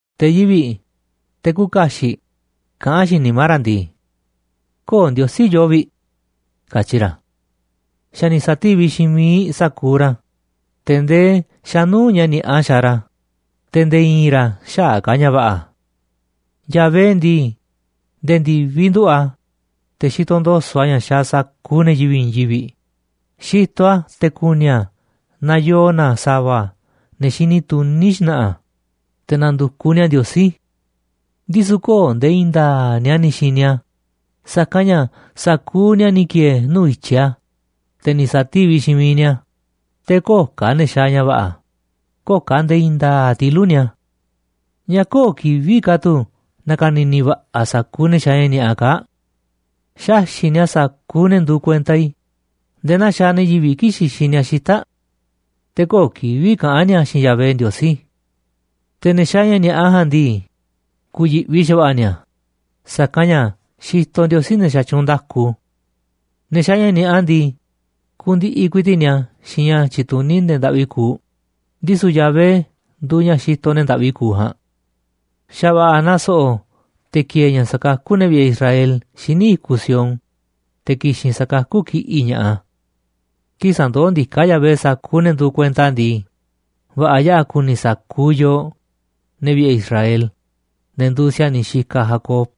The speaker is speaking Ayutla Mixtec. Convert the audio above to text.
Te̱ yivi̱ꞌ, te̱ küuꞌ kaxiꞌ, kaꞌán xiinꞌ nimá ra̱ ndii: “Köo̱ꞌ Ndiosí yoo vi̱ꞌ”, katyi ra̱. Xa̱ ni̱ sa̱tíviꞌ xiinꞌ miiꞌ sa̱kuuꞌ ra̱, te̱ ndee xa̱ nuu̱ꞌ ña̱ ni̱a̱ꞌa xaaꞌ ra̱, te̱ nde̱e̱ i̱i̱n ra̱ xäaꞌ ka̱ ña̱ va̱ꞌa̱. Yahvé ndii, nde̱e̱ ndi̱viꞌ nduꞌu̱ꞌ a̱, te̱ xitoꞌ ndo̱so̱ꞌ a̱ ña̱ xaaꞌ sa̱kuuꞌ ne̱ yivi̱ꞌ i̱i̱n yivi̱ꞌ, xitoꞌ a̱ te̱ ku̱ni̱ a̱ naaꞌ yoo na sa̱va̱ ne̱ xini tuní xna̱ꞌa̱, te̱ na̱ndu̱kuꞌ ni̱a̱ Ndiosí. Ndisu̱ köo̱ꞌ nde̱e̱ i̱i̱n nda̱a̱ꞌ ni̱a̱ ni̱ xi̱ni̱ a̱, sa̱kanꞌ ña̱ sa̱kuuꞌ ni̱a̱ ni̱ ki̱e̱e̱ nuu̱ꞌ i̱tyiꞌ a̱, te̱ ni̱ sa̱tíviꞌ xiinꞌ miiꞌ ni̱a̱, te̱ köo̱ꞌ ka̱ ne̱ xaaꞌ ña̱ va̱ꞌa̱, köo̱ꞌ ka̱ nde̱e̱ i̱i̱n nda̱a̱ꞌ tilu̱ꞌ ni̱a̱. ¿Ñáá köo̱ꞌ kivi̱ꞌ ka̱ tu̱ na̱ka̱ni̱ni̱ va̱ꞌa̱ sa̱kuuꞌ ne̱ xaaꞌ ña̱ ni̱a̱ꞌa kaa̱ꞌ? Xaxi̱ꞌ ni̱a̱ sa̱kuuꞌ ne̱ nduuꞌ kuenta i̱ nde̱e̱ naa xaaꞌ ne̱ yivi̱ꞌ kii̱ꞌ xixiꞌ ni̱a̱ xita̱ꞌ. Te̱ köo̱ꞌ kivi̱ꞌ kaꞌán ni̱a̱ xiinꞌ Yahvé Ndiosí. Te̱ ne̱ xaaꞌ ña̱ ni̱a̱ꞌa ja̱a̱nꞌ ndii, ku̱yi̱ꞌvi xa̱va̱ꞌa̱ ni̱a̱, sa̱kanꞌ ña̱ xitoꞌ Ndiosí ne̱ xatyuunꞌ nda̱ku. Ne̱ xaaꞌ ña̱ ni̱a̱ꞌa ndii, kundiꞌiꞌ ku̱i̱ti̱ꞌ ni̱a̱ xiinꞌ ña̱ tyituní ne̱ ndaꞌvi kuuꞌ, ndisu̱ Yahvé nduuꞌ ña̱ xitoꞌ ne̱ ndaꞌvi kuuꞌ ja̱a̱nꞌ. Xa̱ va̱ꞌa̱ naaꞌ so̱ꞌo̱ te̱ ki̱e̱e̱ ña̱ sa̱kakú ne̱ vi̱ꞌe̱ Israel xíniꞌ i̱kuꞌ Sión, te̱ ki̱xi̱n sa̱kakú kiꞌi̱ꞌ ña̱ꞌaꞌ a̱. Kii̱ꞌ sa̱ndoó ndiká Yahvé sa̱kuuꞌ ne̱ nduuꞌ kuenta a̱ ndii, va̱ꞌa̱ yaꞌa̱ ku̱ni̱ sa̱kuuꞌ yooꞌ, ne̱ vi̱ꞌe̱ Israel, ne̱ nduuꞌ si̱a̱niꞌ xikaꞌ Jacob.